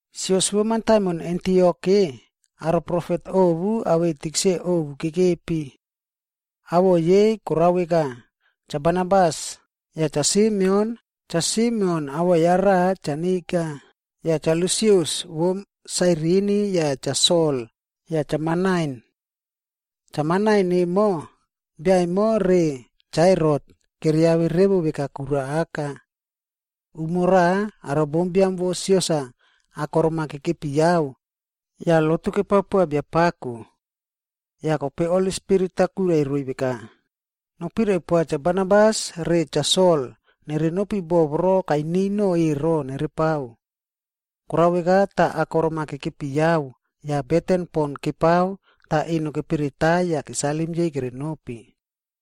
Sios vo mataimon Antiok-e, aro profet ovu awei tikse ovu kekepi. Awoꞌo yei korao veka, Cha Barnabas, yah Cha Simeon, Cha Simeon awoꞌo ya raꞌa Cha Niga,a yah Cha Lusius vo Sairini yah Cha Sol yah Cha Manain. (Cha Manain emo, bia emo re Cha Herot keriave revo veka kura aka.) Umo raꞌa, aro bombiam vo sios-a akorom-a kekepi yao yah lotu kepao poa Biapako. Yah kope Holi Spirit-a kwirai roiy veka, “Nopirai poa Cha Barnabas re Cha Sol nere nopi boꞌo voro kainiy no ero nerepao.” Korao veka tah akorom-a kekepi yao yah beten pon kepao tah eno keperetai yah kesalim yei kerenopi.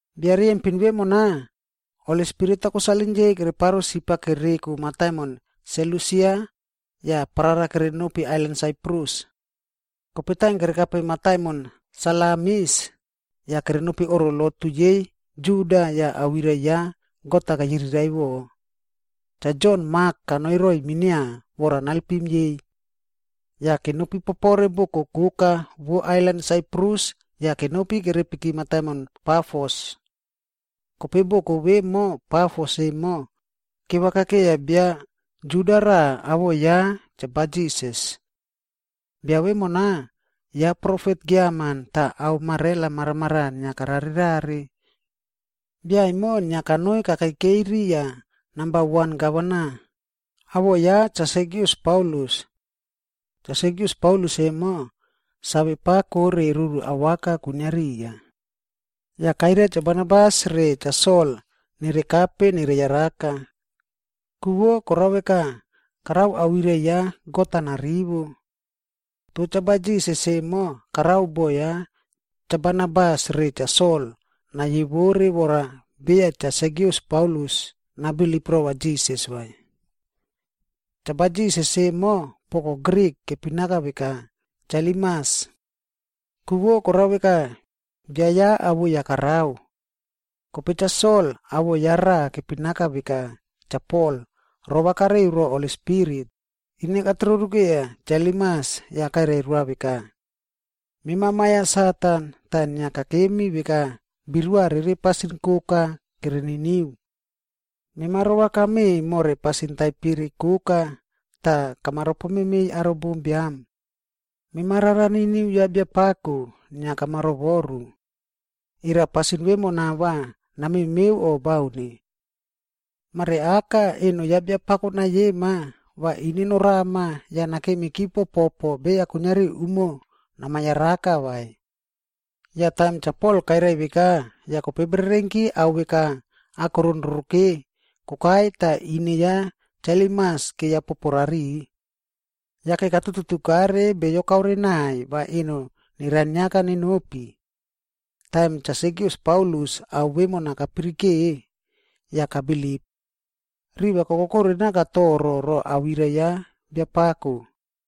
Bia riyempin vemona, Holi Spirit-a kosalim yei kereparo sip-a kereko mataimon Selusia yah parara kerenopi ailan Saiprus. Kope taim kerekape mataimon Salamis, yah kerenopi oꞌro lotu yei Juda yah awirai ya God-a keyiriraiꞌvo. Cha Jon Mak kanoi roiy minia vora nalpim yei. Yah kenopi popore boko koka vo ailan Saiprus yah kenopi kerepiki mataimon Pafos. Kope boko vemo Pafos emo, kevakakeiya bio Juda raꞌa, awoꞌo ya Cha Barjisas. Bia vemona, ya profet giaman tah ao marela maramaraꞌa inia karare rare. Bia emo inia kanoi kakekei riya namba wan gavana, awoꞌo ya Cha Sergius Paulus. Cha Sergius Paulus emo, save pako re ruru awaka kwinia riya. Yah kairia Cha Barnabas re Cha Sol nerekape nereyaraka. Ku vo korao veka, karao awirai ya God-a narivo. Toh Cha Barjisas emo karao boꞌo ya Cha Barnabas re Cha Sol nayewore vora beya Cha Sergius Paulus nabilip rova Jisas vai. Cha Barjisas emo, (poko Grik, kepinaka veka Cha Elimas. Ku vo korao veka, bia ya awoi-a karao). Kope Cha Sol, awoꞌo ya raꞌa kepinaka veka Cha Pol, rova kareu ro Holi Spirit, ine katroru keiya Cha Elimas, yah kairai roa veka, “Mema ma ya Satan, tah inia kakemi veka birua rere pasin koka kereniniu. Mema rova kame more pasin taipere koka tah kama ropomemeiy aro bombiam. Mema rara niniu ya Biapako inia kama rovoru. Era pasin vemona va namemeu o baun? Mare aka eno ya Biapako nayema, va ine norama yah nakemiki popoꞌpo beya kuiniari umo nama yaraka vai.” Yah taim Cha Pol kairai veka, yah kope bererenki ao veka akoron roroke kokai tah ine ya Cha Elimas keiya popo rariꞌi. Yake katuꞌtutukare beyo kaore naiy va eno neraniaka nenopi. Taim Cha Sergius Paulus ao vemona kapirike, yah kabilip. Riva kokokore naka toro ro awirai ya Biapako.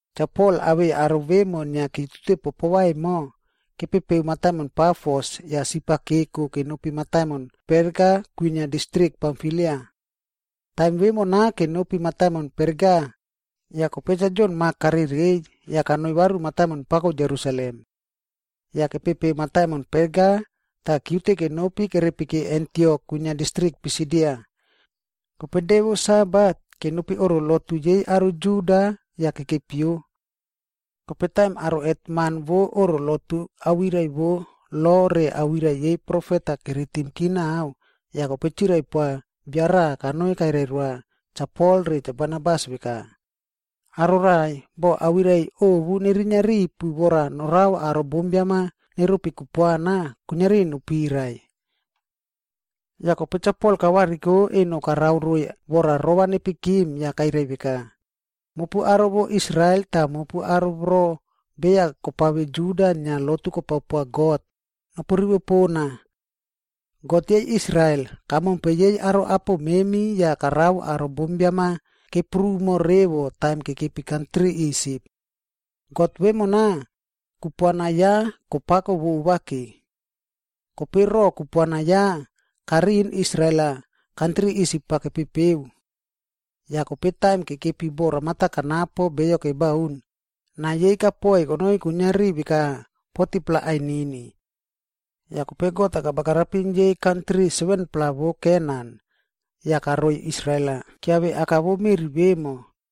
Cha Pol awei aro vemo inia kiutute popova emo, kepepeu mataimon Pafos yah sip-a keko kenopi mataimon Perga kwinia distrik Pamfilia. Taim vemona kenopi mataimon Perga, yah kope Cha Jon Mak karereiy, yah kanoi varu mataimon pako Jerusalem. Yah kepepeu mataimon Perga yah kiute kenopi kerepiki Antiok kwinia distrik Pisidia. Kope de vo Sabat, kenopi oꞌro lotu yei aro Juda yah kekepio. Kope taim aro hetman vo oꞌro lotu awirai vo lo re awirai yei profet-a keritimki naꞌao, yah kope chirai poa bia raꞌa kanoi kairai roa Cha Pol re Cha Barnabas veka, “Aro raꞌai, boh awirai ovu nerinia ripu vora norao aro bombiam-a neropi kupuana, kuiniari nopirai.” Yah kope Cha Pol kavariko eno karao roiy vora rova nepikim yah kairai veka, “Mopu aro vo Israel tah mopu aro voro beya kopave Juda inia lotu kopao poa God, nopu rivo pona. God yei Israel, kamompe yei aro apo memi yah karao aro bombiam-a keprumo revo taim kekepi kantri Isip. God vemona, kupuana ya kopako vovake. Kope ro kupuana ya, kariꞌin Israel-a kantri Isip-a kepepeu. Yah kope taim kekepi boꞌo ramata kanapo beyo kebaun, nai yei kapoi konoi kuiniari veka 40-pla ainini. Yah kope God-a kabagarapim yei kantri 7-pla vo Kenan, yah karoi Israel-a kiave aka vo meꞌri vemo.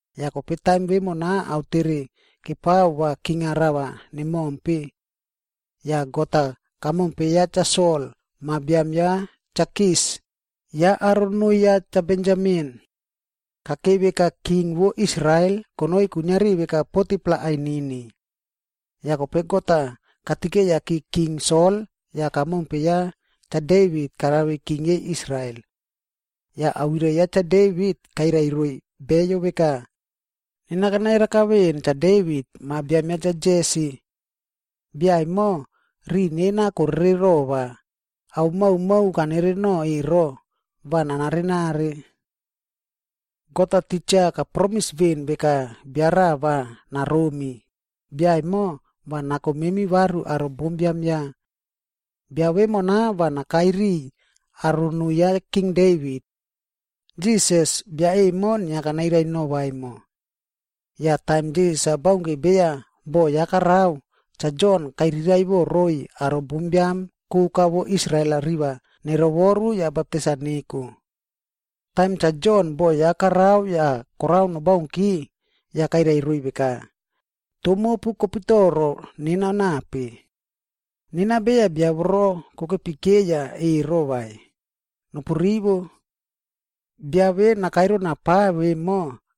Yah kope taim vemona aotere kepao va king-a rava nemompe. Yah God-a kamompe ya Cha Sol ma biam ya Cha Kis, ya aro noo ya Cha Benjamin. Kakei veka king vo Israel konoi kuiniari veka 40-pla ainini. Yah kope God-a katikeyaki king Sol yah kamompe ya Cha Devit karave king yei Israel. Yah awirai ya Cha Devit kairai roiy beyo veka, ‘Nena kana yaraka veꞌen Cha Devit ma biam ya Cha Jesi. Bia emo, riꞌi nena korere rova, ao maomao kanereno ero, va narare rare.’ “God-a titja kapromis veꞌen veka bia raꞌa va naromi, bia emo va nako memi varu aro bombiam ya. Bia vemona va nakai riꞌiy aro noo ya King Devit. Jisas, bia emo inia kanairai nova emo. Yah taim Jisas-a baunke beya boꞌo ya karao, Cha Jon kairiraiꞌvo roiy aro bombiam koka vo Israel-a riva nerovoru yah baptais-a neko. Taim Cha Jon boho ya karao yah korao nobaunki, yah kairai roiy veka, ‘Toh mopu kopitoro nena nape? Nena beya bia voro kokepi keiya ero vai. Nopu rivo! Bia ve nakai rona pa vemo,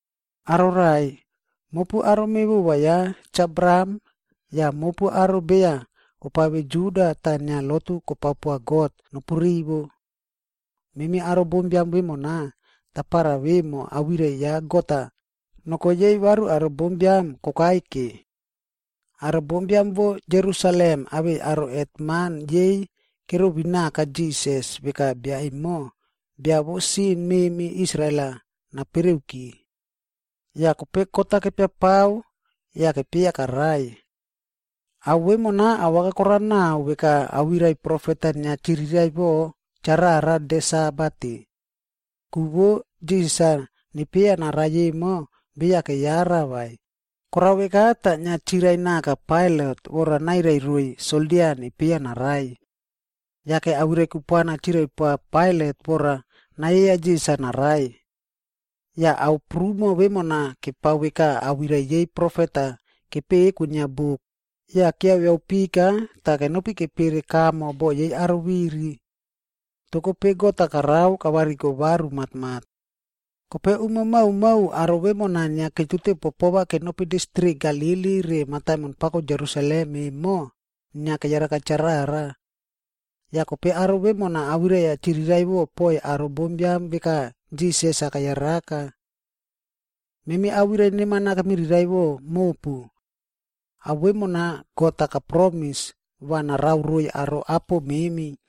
“Aro raꞌai, mopu aro mevova ya Cha Abraham yah mopu aro beya kopave Juda tah inia lotu kopao poa God, nopu rivo. Memi aro bombiam vemona, tapara vemo awirai ya God-a noko yei varu aro bombiam kokai ke. Aro bombiam vo Jerusalem awei aro hetman yei kerovinaka Jisas veka bia emo, bia vo sin memi Israel-a napereuki. Yah kope kot-a kepia pao yah kepieya karai. Ao vemona awaka korao nao veka awirai profet-a inia chiriraiꞌvo charara de Sabat-e. Ku vo Jisas-a nepieya narai emo, beya keyara vai, korao veka tah inia chirai naka Pailat vora nairai roiy soldia nepieya narai. Yake awirai kupuana chirai poa Pailat vora nayieya Jisas-a narai. Yah ao prumo vemona kepao veka awirai yei profet-a kepeꞌe kwinia buk, yah kiaviaꞌo pika tah kenopi kepere kamo boꞌo yei aro viri. Toh kope God-a karao kavariko varu matmat. Kope umo maomao aro vemona inia kiutute popova kenopi distrik Galili re mataimon pako Jerusalem emo inia keyaraka charara. Yah kope aro vemona awirai-a chiriraiꞌvo poiy aro bombiam veka Jisas-a keyaraka. “Memi awirai neman-a kemiriraiꞌvo mopu. Ao vemona God-a kapromis va narao roiy aro apo memi.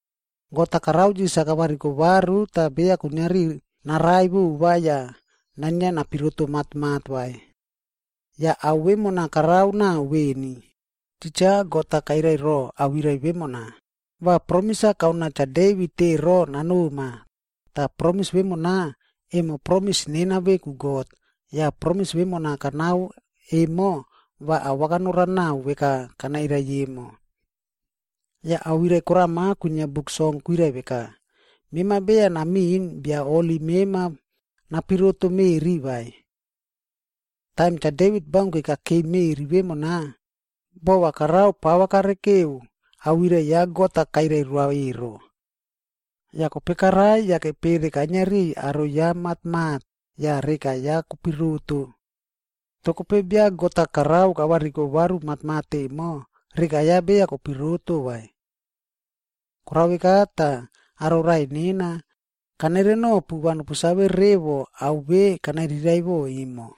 God-a karao Jisas-a kavariko varu tah beya kuiniari narai vova yah nainia napiroto matmat vai. Yah ao vemona korao nao veni, titja God-a kairai ro awirai vemona, ‘Va promis-a kanoa Cha Devit ero nanoma, tah promis vemona, emo promis nena veku God, yah promis vemona kanao emo va awaka norao nao veka kanairai emo.’ Yah awirai korama kwinia Buk Song kwirai veka, ‘Mema beya namiꞌin Bia Holi mema napiroto meꞌri vai.d’” “Taim Cha Devit baunke kakeiy meꞌri vemona, boꞌo va karao pava karekeu awirai ya God-a kairai roa ero. Yah kope karai yah kepere kainia riꞌiy aro ya matmat yah reka ya kopiroto. Toh kope bia God-a karao kavariko varu matmat emo, reka ya beya kopiroto vai. “Korao veka tah, aro raꞌai nena, kanere nopu va nopu save revo ao ve kanairiraiꞌvo emo.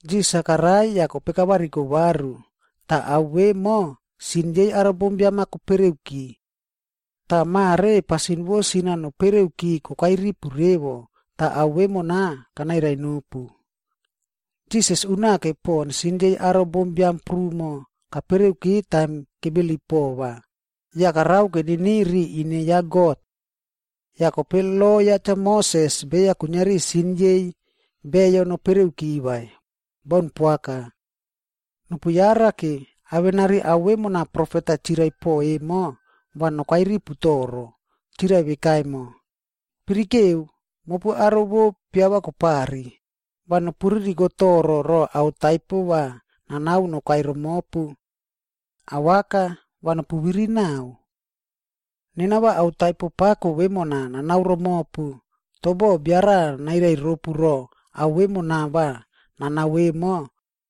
Jisas-a karai yah kope kavariko varu, tah ao vemo sin yei aro bombiam-a kopereuki. Tah mare pasin vo sin-a nopereuki kokai ripu revo, tah ao vemona kanairai nopu. Jisas unake pon sin yei aro bombiam prumo kapereuki taim kebilip pova, yah karao keniniu riya ine ya God. Yah kope lo ya Cha Moses beya kuiniari sin yei beyo nopereuki vai. Baun poaka. Nopu yarake, awenari ao vemona profet-a chirai po emo va nokai ripu toro. Chirai veka emo, ‘Pirikeu, mopu aro vo piava kopari, va nopu ririko toro ro ao taipo va nanao nokai romopu. Awaka, va nopu viri nao. Nena va ao taipo pako vemona nanao romopu, toh boh bia raꞌa nairai ropu ro ao vemona va nanao emo,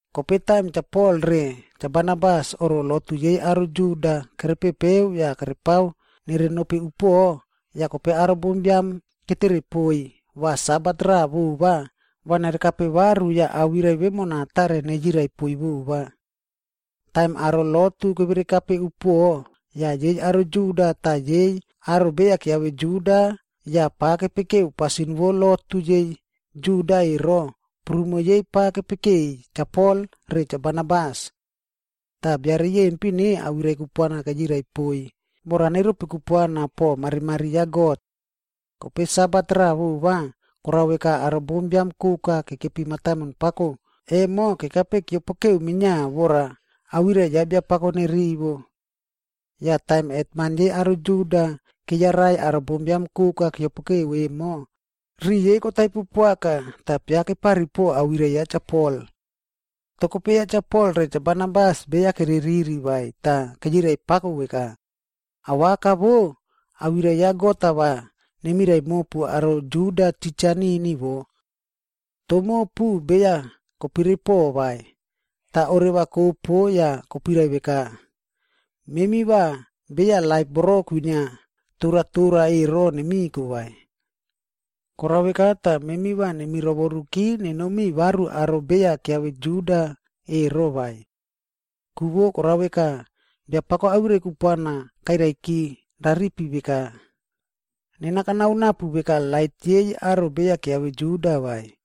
Kope taim Cha Pol re Cha Barnabas oꞌro lotu yei aro Juda kerepepeu yah kerepao nerenopi upuoꞌo, yah kope aro bombiam ketere poiy va Sabat raꞌa vova va nerekape varu yah awirai vemona tare nereyirai poiy vova. Taim aro lotu keverekape upuoꞌo, yah yei aro Juda tah yei aro beya kiave Juda yah pa kepekeu pasin vo lotu yei Juda ero, prumo yei pa kepekeiy Cha Pol re Cha Barnabas. Tah bia riyempin-e awirai kupuana keyirai poiy vora neropi kupuana po marimari ya God. Kope Sabat raꞌa vova, korao veka aro bombiam koka kekepi mataimon pako emo kekape keopokeu minia vora awirai ya Biapako nerivo. Yah taim hetman yei aro Juda keyarai aro bombiam koka keopokeu emo, riꞌi yei kotaipo poaka tah piakepari po awirai ya Cha Pol. Toh kope ya Cha Pol re Cha Barnabas beya kereriri vai tah keyirai pako veka, “Awaka vo, awirai ya God-a va nemirai mopu aro Juda titja nini wo. Toh mopu beya koperepo vai, tah oreva kopo yah kopuirai veka, ‘Memi va beya laip voro kwinia toratora ero nemiko vai.’ Koraka veka tah memi va nemi rovoruki nenomiy varu aro beya kiave Juda ero vai. Ku vo korao veka, Biapako awirai kupuana kairaiki raripi veka, ‘Nena kanao napu veka lait yei aro beya kiave Juda vai,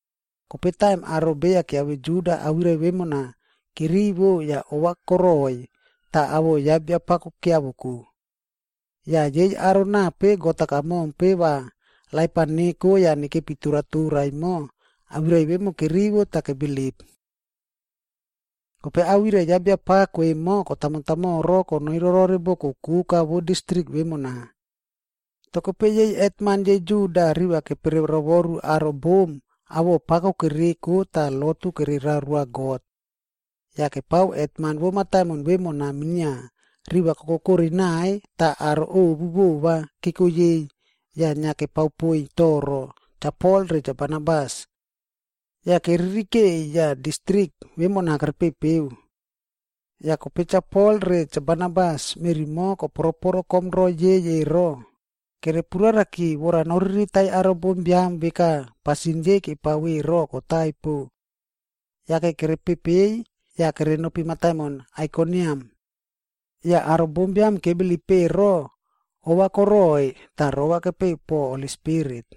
Kope taim aro beya kiave Juda awirai vemona kerivo yah ova koroi tah awoꞌo ya Biapako kiavoko. Yah yei aro nape God-a kamompe va laip-a neko yah nekepi toratora emo, awirai vemo kerivo tah kebilip. Kope awirai ya Biapako emo kotamo tamoro konoi rorore boko koka vo distrik vemona. Toh kope yei hetman yei Juda riva kepere rovoru aro bom awoꞌo pako kereko tah lotu kererao roa God. Yah kepao hetman vo mataimon vemona minia, riva kokokore naiy tah aro ovu vova keko yei, yah inia kepao poiy toro Cha Pol re Cha Barnabas. Yah keririkeiy yah distrik vemona kerepepeu. Yah kope Cha Pol re Cha Barnabas meꞌri mo koporoporo komro yei ero, kerepuraraki vora noriritai aro bombiam veka pasin yei kepao ero kotaipo. Yake kerepepei yah kerenopi mataimon Aikoniam. Yah aro bombiam kebilip ero ova koroiy tah rova kepeu po Holi Spirit.